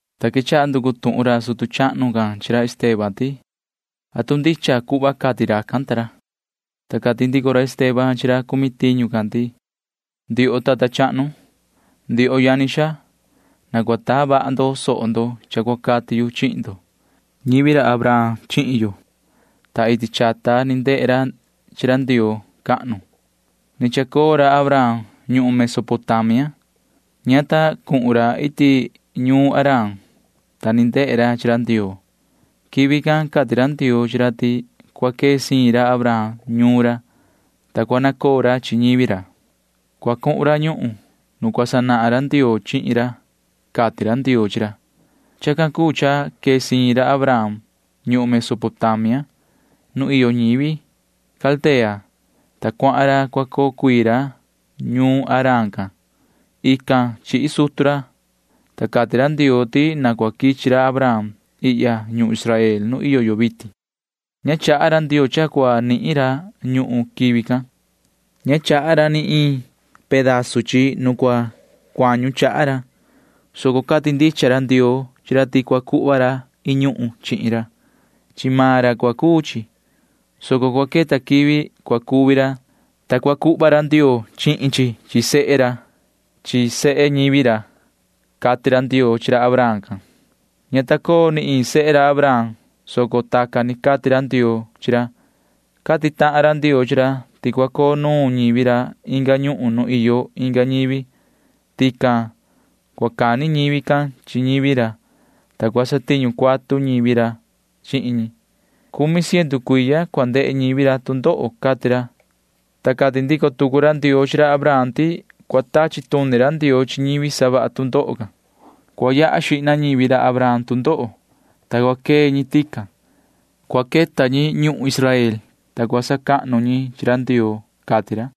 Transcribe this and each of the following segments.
Ta quechaha nducu tuhun ra sutu chahnu can chi ra Esteban ti: ―¿Atu ndicha cuhva cati racan ta ra? Ta cati ndico ra Esteban chi ra cumi tiñu can ti: ―Ndioho tata chahnu, ndioho yani xaa, na cua taa vaha ndo soho ndo cha cua cati yu chihin ndo. Ñivi ra Abraham chihin yo, ta iti chata ni ndehe ra chi ra Ndioo cahnu. Ni chacoo ra Abraham ñuhun Mesopotamia. Ña ta cuhun ra iti ñuun Harán, ta ni ndehe ra chi ra Ndioo. Quivi can cati ra Ndioo chi ra ti cua quee siin ra Abraham ñuun ra, ta cua nacoo ra ñivi ra. Cua cuhun ra ñuhun nu cua sanahan Ndioo chihin ra, cati ra Ndioo chi ra. Chacan cuu cha quee siin ra Abraham ñuhun Mesopotamia nu iyo ñivi Caldea, ta cuahan ra cua coo cuii ra ñuun Harán can. Ican chihi sutu ra, ta cati ra Ndioo ti na cua quichi ra Abraham ihya ñuhun Israel nu iyo yo vitin. Ña chaha ra Ndioo cha cua nihin ra ñuhun quivi can. Ña chaha ra ni iin pedazu chi nu cua cuañu chaha ra, soco cati ndicha ra Ndioo chi ra ti cua cuhva ra iin ñuhun chihin ra. Chi maan ra cua cuu chi, soco cua queta quivi cua cuvi ra, ta cua cuhva ra Ndioo chihin chi chi sehe ra chi ñivi sehe ra, cati ra Ndioo chi ra Abraham can. Ña ta coo ni iin sehe ra Abraham, soco tacan ni cati ra Ndioo chi ra. Cati tahan ra Ndioo chi ra ti cua coo nuun ñivi ra inga ñuhun nu iyo inga ñivi. Tican cua cani ñivi can chi ñivi ra, ta cua satiñu cuatu ñivi ra chihin ñi. Cumi ciendu cuiya cua ndehe ñivi ra tu ndoho, cati ra. Ta cati ndico tucu ra Ndioo chi ra Abraham ti cua tachi tuni ra Ndioo chi ñivi savaha tu ndoho can. Cua yaha xihna ñivi ra Abraham tu ndoho, ta cua quee ñi tican. Cua queta ñi ñuhun Israel, ta cua sacahnu ñi chi ra Ndioo, cati ra.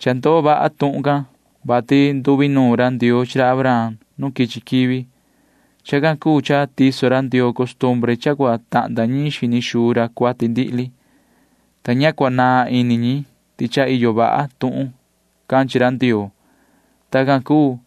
Cha ndoo vaha tuhun can, vati nduinuun ra Ndioo chi ra Abraham nu quichi quivi. Chacan cuu cha tiso ra Ndioo costumbre cha cua tahnda ñiin xini xuu ra cuati ndihli, ta ña cua naan ini ñi ti cha iyo vaha tuhun can chi ra Ndioo. Tacan cuu,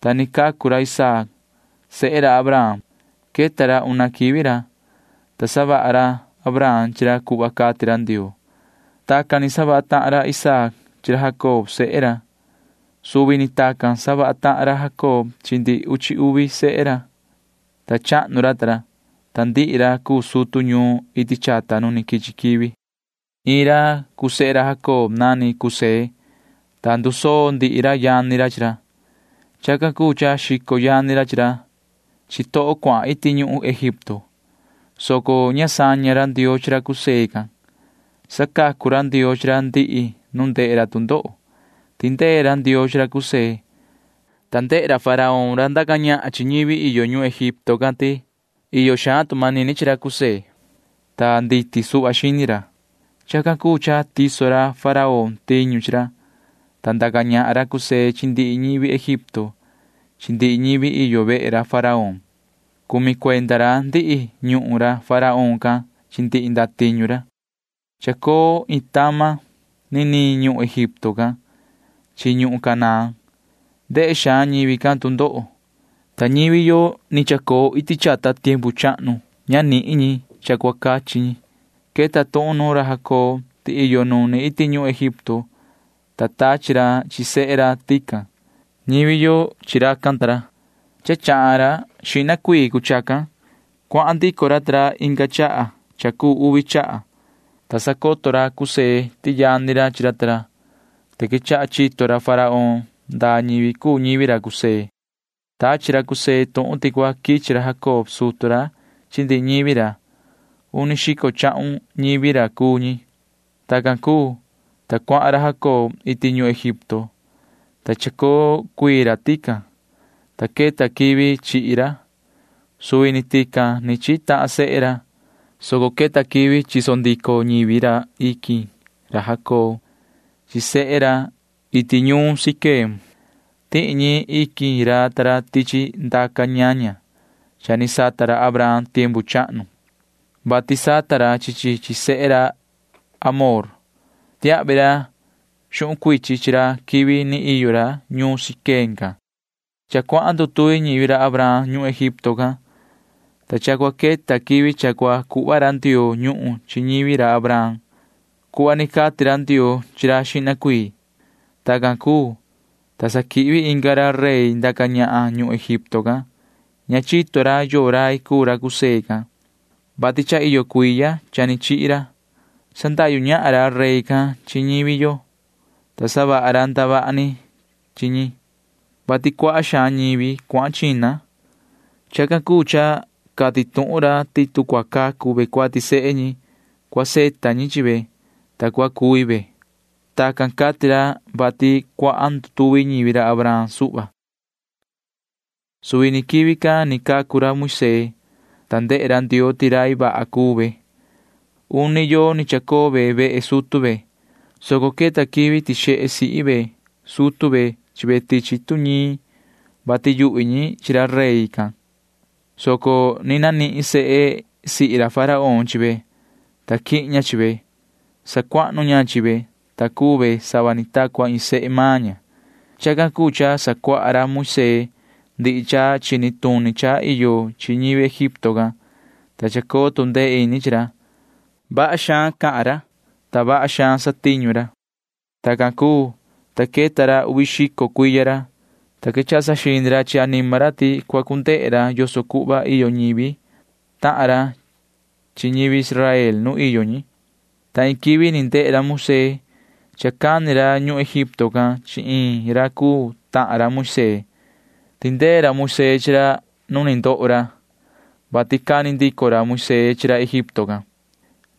ta ni cacu ra Isaac sehe ra Abraham. Queta ra una quivi ra, ta savaha ra Abraham chi ra cuhva cati ra Ndioo. Tacan ni savaha tahan Isaac chi ra Jacob sehe ra. Suvi ni tacan savaha tahan ra Jacob chi ndihi uchi uvi sehe ra, ta chahnu ra ta ra, ta ndihi ra cuu sutu ñuun iti chata nu ni quichi quivi. ’Iin ra cuu sehe ra Jacob nani José, ta ndusoo ndihi ra yani ra chi ra. Chacan cuu cha xico yani ra chi ra chi toho cuahan iti ñuhun Egipto, soco ña saña ra Ndioo chi ra José can. Sacacu ra Ndioo chi ra ndihi nu ndehe ra tu ndoho. Tindee ra Ndioo chi ra José, ta ndehe ra Faraón ra ndaca ñahan chi ñivi iyo ñuhun Egipto can ti iyo xaan tu manini chi ra José, ta nditi suhva xini ra. Chacan cuu cha tiso ra Faraón tiñu chi ra, ta ndaca ñahan ra José chi ndihi ñivi Egipto chi ndihi ñivi iyo vehe ra Faraón. Cumi cuenda ra ndihi ñuhun ra Faraón can chi ndihi ndatiñu ra. ’Chacoo iin tama niniin ñuhun Egipto can chi ñuhun Canaán. Ndehe xaan ñivi can tu ndoho, ta ñivi yo ni chacoo iti chata tiempu chahnu ña nihin ñi cha cua cachi ñi. Queta tuhun nuun ra Jacob ti iyo nuni iti ñuhun Egipto, ta tachi ra chi sehe ra tican. Ñivi yo chi racan ta ra. Cha chahan ra xihna cuii cuu chacan. Cuahan ndico ra ta ra inga chaha cha cuu uvi chaha, ta sacoto ra José ti yani ra chi ra, ta quechaha chito ra Faraón ndaa ñivi cuu ñivi ra José. Tachi ra José tuhun ti cua quichi ra Jacob sutu ra chi ndihi ñivi ra. Uni xico chahun ñivi ra cuu ñi. Tacan cuu, ta cuahan ra Jacob iti ñuhun Egipto, ta chacoo cuii ra tican, ta queta quivi chihi ra. Suvi ni tican ni chihi tahan sehe ra, soco queta quivi chiso ndico ñivi ra iquin ra Jacob chi sehe ra iti ñuun Siquem. Tihi ñi iquin ra ta ra tichi ndaca ñaña cha ni sata ra Abraham tiempu chahnu, vati sata ra chi chi chi sehe ra Hamor. Tiahvi ra xuhun cuichin chi ra quivi ni iyo ra ñuun Siquem can. ’Cha cuahan ndutuvi ñivi ra Abraham ñuhun Egipto can, ta cha cua queta quivi cha cua cuhva ra Ndioo ñuhun chi ñivi ra Abraham cuhva ni cati ra Ndioo chi ra xihna cuii. Tacan cuu, ta sa quihvi inga ra rey ndaca ñahan ñuhun Egipto can. Ña chito ra yoo rai cuu ra José can, vati cha iyo cuiya cha ni chihi ra. Sandahyu ñahan ra rey can chi ñivi yo, ta savaha ra ndavaha ni chi ñi, vati cuaha xaan ñivi cuahan china. Chacan cuu cha cati tuhun ra ti tu cua cacu ve cuati sehe ñi, cua savita ñi chi ve, ta cua cuvi ve. [Tacan cati ra, vati cuahan ndutuvi ñivi ra Abraham suhva.] Suvi ni quivi can ni cacu ra Moisee, ta ndehe ra Ndioo ti rai vaha cuu ve. Uni yoo ni chacoo ve vehe sutu ve, soco queta quivi tixehe sihi ve sutu ve chi ve tichi tuñiin, vati yuhvi ñi chi ra rey can, soco ni nanihin sehe sihi ra Faraón chi ve, ta quihin ña chi ve. Sacuahnu ña chi ve, ta cuu ve sava ni ta cua iin sehe maan ña. Chacan cuu cha sacuaha ra Moisee ndihi cha chini tuni cha iyo chi ñivi Egipto can, ta chacoo tu ndee ini chi ra. Vaha xaan cha cahan ra, ta vaha xaan satiñu ra. ’Tacan cuu, ta queta ra uvi xico cuiya ra, ta quechaha saxini ra chi anima ra ti cua cu ndehe ra yoso cuhva iyo ñivi tahan ra ñivi Israel nu iyo ñi, ta iin quivi ni ndehe ra Moisee cha cani ra ñuhun Egipto can chi iin ra cuu tahan ra Moisee. Tindee ra Moisee chi ra ni ndoho, vati cani ndico ra Moisee chi ra Egipto can.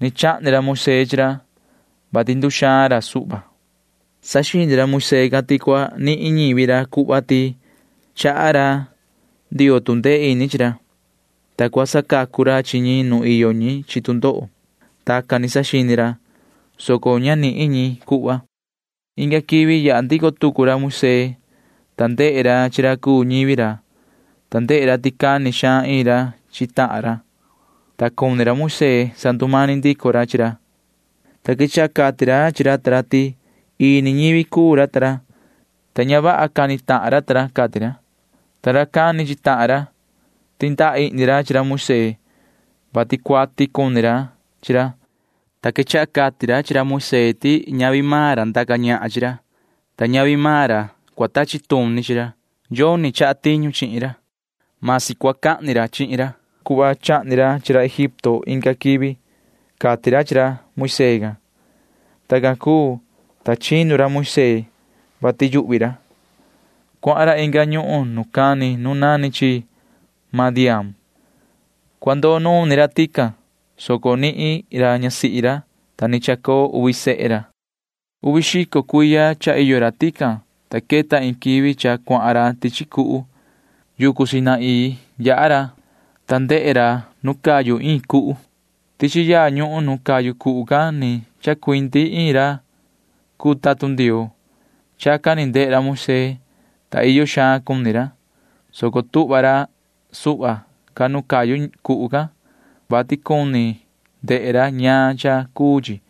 Ni chahni ra Moisee chi ra, vati nduxaan ra suhva. Saxini ra Moisee can ti cua nihin ñivi ra cuhva ti chaha ra Ndioo tu ndee ini chi ra, ta cua sacacu ra chi ñi nu iyo ñi chi tu ndoho. Tacan ni saxini ra, soco ña nihin ñi cuhva. Inga quivi yaha ndico tucu ra Moisee, ta ndehe ra chi ra cuu ñivi ra. Ndehe ra ti cani xaan iin ra chi tahan ra, ta cuni ra Moisee sandumani ndico ra chi ra, ta quechaha cati ra chi ra ta ra ti ini ñivi cuu ra ta ra, ta ña vaha cani tahan ra ta ra, cati ra. Ta ra cani chi tahan ra―tindaihni ra chi ra Moisee, vati cuati cuni ra chi ra, ta quechaha cati ra chi ra Moisee ti ñavi maan ra ndaca ñahan chi ra. Ñavi maan ra tachi tuni chi ra. Yoni tiso tiñu chihin ra. Vasi cua cahni ra chihin ra cuhva chahni ra chi ra Egipto inga quivi, cati ra chi ra Moisee. Tacan cuu, ta chinu ra Moisee, vati yuhvi ra. Cuahan ra inga ñuhun nu cani nu nani chi Madián. Cua ndoo nuun ni ra tican, soco nihin ra ñasihi ra, ta ni chacoo uvi sehe ra. ’Uvi xico cuiya cha iyo ra tican, ta queta iin quivi cha cuahan ra tichi cuhu. Yucu Sinaí yaha ra, ta ndehe ra nu cayu iin cuhu. Tichi yaa ñuhun nu cayu cuhu can ni chacuindi iin ra cuu tatun Ndioo. Chacan ni ndehe ra Moisee, ta iyo xaan cuni ra, soco tuhva ra suhva ca nu cayu cuhu can, vati cuni ndehe ra ñaan cha cuu chi.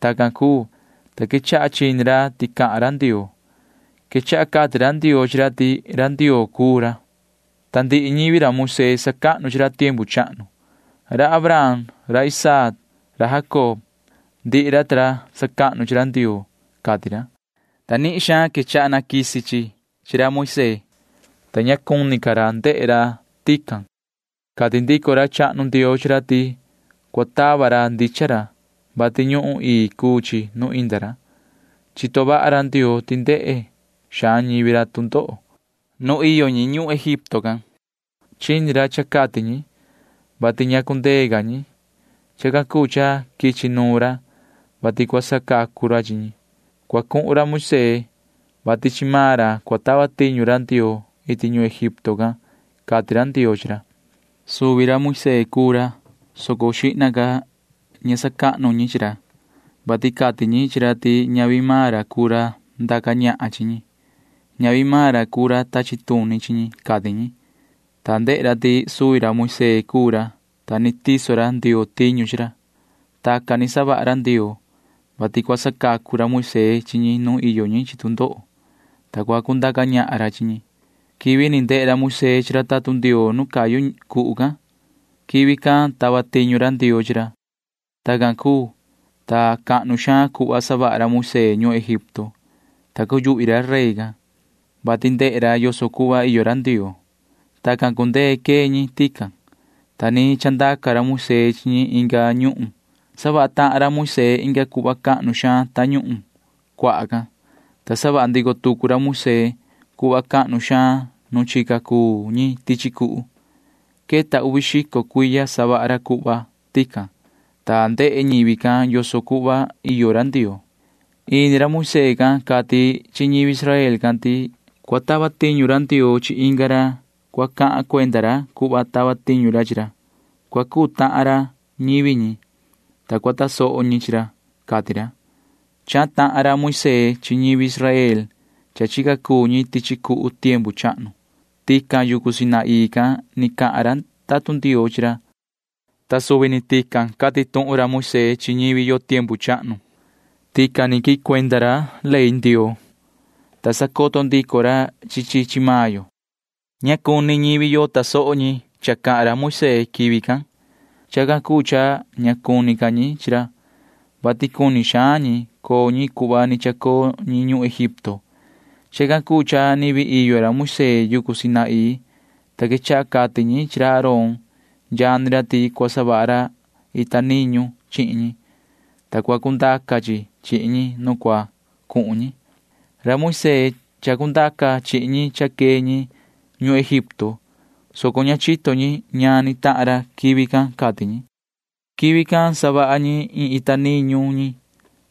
Tacan cuu, ta quechaha chini ra ti cahan ra Ndioo. Quechaha cati ra Ndioo chi ra ti ra Ndioo cuu ra, ta ndihi ñivi ra Moisee sacahnu chi ra tiempu chahnu. Ra Abraham, ra Isaac, ra Jacob―ndihi ra ta ra sacahnu chi ra Ndioo, cati ra, ta nihin xaan quechaha quisi chi chi ra Moisee, ta ña cuni ca ra ndehe ra tican. Cati ndico ra chahnu Ndioo chi ra ti cua tava ra ndichan ra, vati ñuhun ii cuu chi nu inda ra. Chito vaha ra Ndioo ti ndehe xaan ñivi ra tu ndoho nu iyo ñi ñuhun Egipto can. Chini ra cha cati ñi, vati ña cundee ca ñi. Chacan cuu cha quichi nuun ra, vati cua sacacu ra chi ñi. Cua cuhun ra Moisee, vati chi maan ra cua tava tiñu ra Ndioo iti ñuhun Egipto can, cati ra Ndioo chi ra. ’Suvi ra Moisee cuu ra, soco xihna ca ña sacahnu ñi chi ra, vati cati ñi chi ra ti ñavi maan ra cuu ra ndaca ñahan chi ñi. Ñavi maan ra cuu ra tachi tuni chi ñi, cati ñi. Ta ndehe. Suvi ra Moisee cuu ra, ta ni tiso ra Ndioo tiñu chi ra. Tacan ni savaha ra Ndioo, vati cua sacacu ra Moisee chi ñi nu iyo ñi chi tu ndoho, ta cua cundaca ñahan ra chi ñi. Quivi ni ndehe ra Moisee chi ra tatun Ndioo nu cayu cuhu can―quivi can tava tiñu ra Ndioo chi ra. Tacan cuu, ta cahnu xaan cuhva savaha ra Moisee ñuhun Egipto, ta cuyuhvi ra rey can, vati ndehe ra yoso cuhva iyo ra Ndioo. Tacan cundee quee ñi tican, ta ni chandaca ra Moisee chi ñi inga ñuhun. Savaha tahan ra Moisee inga cuhva cahnu xaan Tañuhun Cuaha can, ta savaha ndico tucu ra Moisee cuhva cahnu xaan nu chica cuu ñi tichi cuhu. Queta uvi xico cuiya savaha ra cuhva tican, ta ndehe ñivi can yoso cuhva iyo ra Ndioo. Ini ra Moisee can cati chi ñivi Israel can ti cua tava tiñu ra Ndioo chi inga ra cua cahan cuenda ra cuhva tava tiñu ra chi ra. Cua cuu tahan ra ñivi ñi, ta cua tasoho ñi chi ra, cati ra. Chahan tahan ra Moisee chi ñivi Israel cha chica cuu ñi tichi cuhu tiempu chahnu. Tican yucu Sinaí can ni cahan ra tatun Ndioo chi ra, ta suvi ni tican cati tuhun ra Moisee chi ñivi yo tiempu chahnu. Tican ni quihin cuenda ra ley Ndioo, ta sacoto ndico ra chi chi chi maan yo. ’Ña cuni tasoho ñivi yo cha cahan ra Moisee quivi can. Chacan cuu cha ña cuni ca ñi chi ra, vati cuni xaan ñi coo ñi cuhva ni chacoo ñi ñuhun Egipto. Chacan cuu cha ni vii iyo ra Moisee yucu Sinaí, ta quechaha cati ñi chi ra Aarón yani ra ti cua savaha ra ita niñu chihin ñi, ta cua cundaca chi chihin ñi nu cua cuhun ñi. Ra Moisee chacundaca chihin ñi cha quee ñi ñuhun Egipto, soco ña chito ñi ñaan ni tahan ra quivi can, cati ñi. Quivi can savaha ñi iin ita niñu ñi.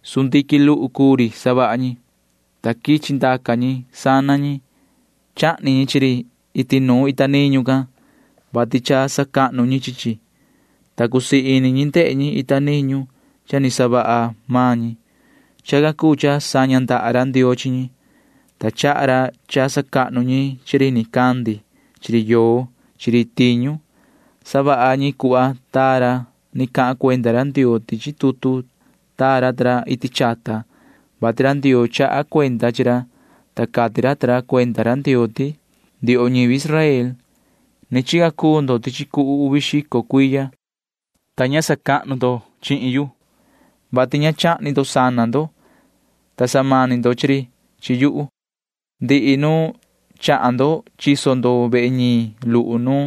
Sundiquin luhu cuu ri savaha ñi, ta quichi ndaca ñi sana ñi. Chahni ñi chi ri iti nuun ita niñu can, vati cha sacahnu ñi chi chi, ta cusii ini ñi ndehe ñi ita niñu cha ni savaha maan ñi. Chacan cuu cha saña ndaha ra Ndioo chi ñi, ta chaha ra cha sacahnu ñi chi ri nicandi chi ri yoo chi ri tiñu. Savaha ñi cuhva taa ra ni cahan cuenda ra Ndioo tichi tutu taa ra ta ra iti chata, vati ra Ndioo chaha cuenda chi ra, ta cati ra ta ra cuenda ra Ndioo ti: Ndioho ñivi Israel, ni chica cuu ndo tichi cuhu uvi xico cuiya, ta ña sacahnu ndo chi yuhu, vati ña chahni ndo sana ndo, ta samani ndo chi ri chi yuhu. Ndihi nu chahan ndo chiso ndo vehe ñiin luhu nu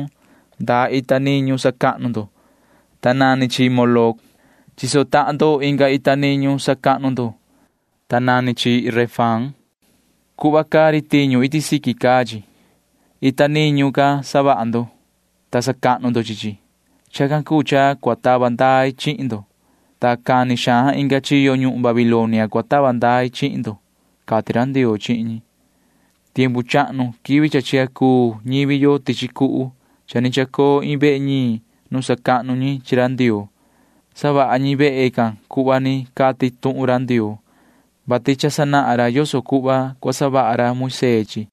ndaa ita niñu sacahnu ndo, ta nani chi Moloc. Chiso tahan ndo inga ita niñu sacahnu ndo, ta nani chi Renfán. Cuhva caa ri tiñu iti siqui caa chi. Ita niñu can savaha ndo, ta sacahnu ndo chi chi. Chacan cuu cha cua tava ndai chihin ndo, ta cani xaan inga chiyo ñuhun Babilonia cua tava ndai chihin ndo, cati ra Ndioo chihin ñi. ’Tiempu chahnu quivi cha chica cuu ñivi yo tichi cuhu cha ni chacoo iin vehe ñiin nu sacahnu ñi chi ra Ndioo. Savaha ñi vehe can cuhva ni cati tuhun ra Ndioo, vati cha sanahan ra yoso cuhva cua savaha ra Moisee chi chi.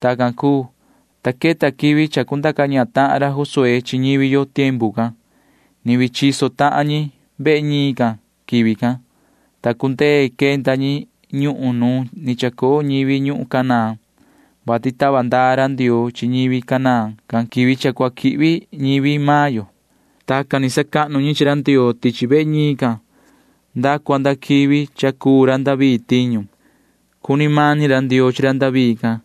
Tacan cuu, ta queta quivi ndaca ñahan ra Josué chi ñivi yo tiempu can. Ni vii chiso tahan ñi vehe ñiin can quivi can, ta cundee quenda ñi ñuhun nu ni chacoo ñivi ñuhun Canaán, vati tava ndaa ra Ndioo chi ñivi Canaán can quivi cha cua quihvi ñivi maan yo. Tacan ni sacahnu ñi chi ra Ndioo tichi vehe ñiin can nda cua nda quivi cha cuu ra David tiñu. Cuni mani ra Ndioo chi ra David can.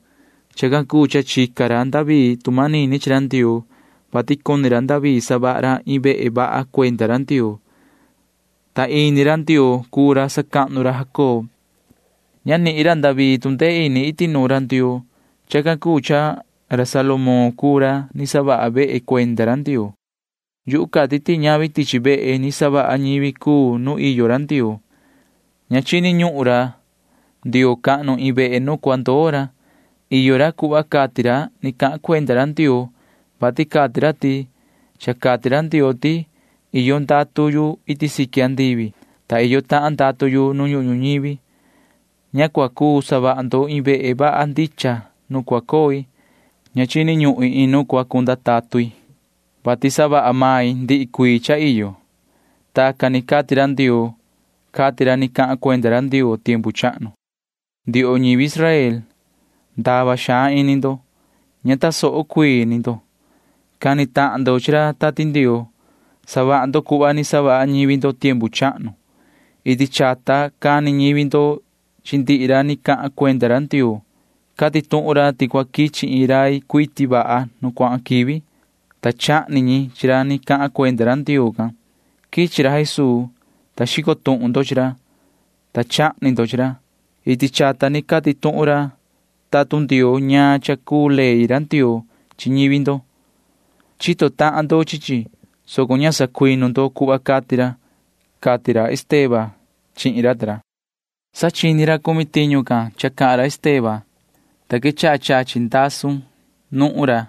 Chacan cuu cha chica ra David tu manini chi ra Ndioo, vati cuni ra David savaha ra iin vehe vaha cuenda ra Ndioo, ta ini ra Ndioo cuu ra sacahnu ra Jacob. Ña nihin ra David tu ndee ini iti nuun ra Ndioo. Chacan cuu cha Salomón cuu ra ni savaha vehe cuenda ra Ndioo. Yuhu cati ti ñavi tichi vehe ni savaha ñivi cuu nu iyo ra Ndioo. Ña chini ñuhun ra Ndioo cahnu iin vehe nu cua ndoo ra. Iyo ra cuhva cati ra ni cahan cuenda ra Ndioo, vati cati ra ti: Cha cati ra Ndioo ti iyo ndatu yu iti siqui andivi, ta iyo tahan ndatu yu nu ñuhun ñuñivi. Ña cua cuu savaha ndo iin vehe vaha ndicha nu cua coi. Ña chini ñuhin iin nu cua cunda tatun i, vati savaha main ndihi cuii cha iyo. Tacan ni cati ra Ndioo, cati ra ni cahan cuenda ra Ndioo tiempu chahnu. ’Ndioho ñivi Israel, ndava xaan ini ndo. Ña tasoho cuii ni ndo. Cani tahan ndo chi ra Tati Ndioo. Savaha ndo cuhva ni savaha ñivi ndo tiempu chahnu. Iti chata cani ñivi ndo chi ndihi ra ni cahan cuenda ra Ndioo. Cati tuhun ra ti cua quichi iin rai cuiti vaha nu cuahan quivi, ta chahni ñi chi ra ni cahan cuenda ra Ndioo can. Quichi ra Jesuu, ta xico tuhun ndo chi ra, ta chahni ndo chi ra. Iti chata ni cati tuhun ra tatun Ndioo ñaan cha cuu ley ra Ndioo chi ñivi ndo. Chito tahan ndo chi chi, soco ña sacuinu ndo cuhva cati ra ―cati ra Esteban chihin ra ta ra. Sa chini ra cumi tiñu can cha cahan ra Esteban, ta quechaha chachi ndasun nuhun ra,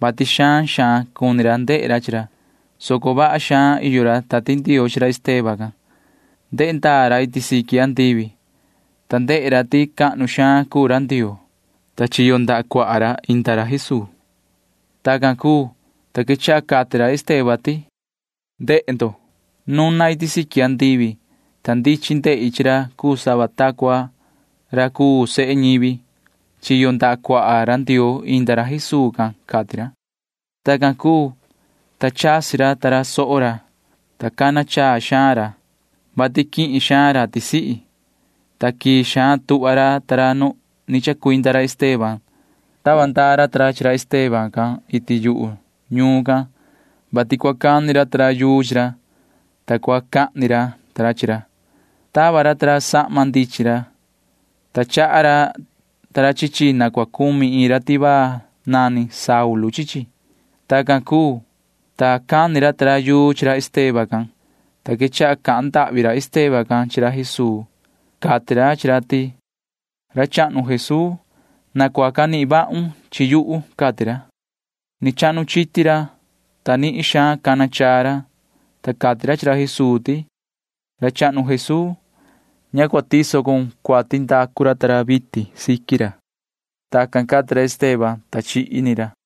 [vati xaan xaan cuni ra ndehe ra chi ra,] soco vaha xaan iyo ra Tati Ndioo chi ra Esteban can. Ndehe ndaa ra iti siqui andivi, ta ndehe ra ti cahnu xaan cuu ra Ndioo, ta chiyo ndaha cuaha ra inda ra Jesuu. Tacan cuu, ta quechaha cati ra Esteban ti: ―¡Jihna! Nuna iti siqui andivi, ta ndichin ndehi chi ra cuu sava ta cua ra cuu sehe ñivi. Chiyo ndaha cuaha ra Ndioo inda ra Jesuu can ―cati ra. Tacan cuu, ta chasi ra ta ra soho ra, ta cana chaa xaan ra, [vati quihin xaan ra tisihi,] ta quii xaan tuhva ra ta ra nu ni chacuinda ra Esteban. Tava ndaa ra ta ra chi ra Esteban can iti yuhu ñuun can, vati cua cani ra yuu chi ra, ta cua cahni ra chi ra. Tava ra ta ra sahma ndichin ra, ta chaha ra chi chi na cua cumi iin ra tivaa nani Saulu chi chi. Tacan cuu, ta cani ra ta ra yuu chi ra Esteban can, ta quechaha cahan ndahvi ra Esteban chi ra Jesuu. Cati ra chi ra ti: ―Yoho ra chahnu Jesuu, na cua canihin vahun chi yuhu ―cati ra. Ni chahnu chiti ra, ta nihin xaan cana chaa ra, ta cati ra chi ra Jesuu ti: ―Yoho ra chahnu Jesuu, ña cua tiso cun cuati ndacu ra vitin siqui ra. Tacan cati ra Esteban, ta chihi ni ra.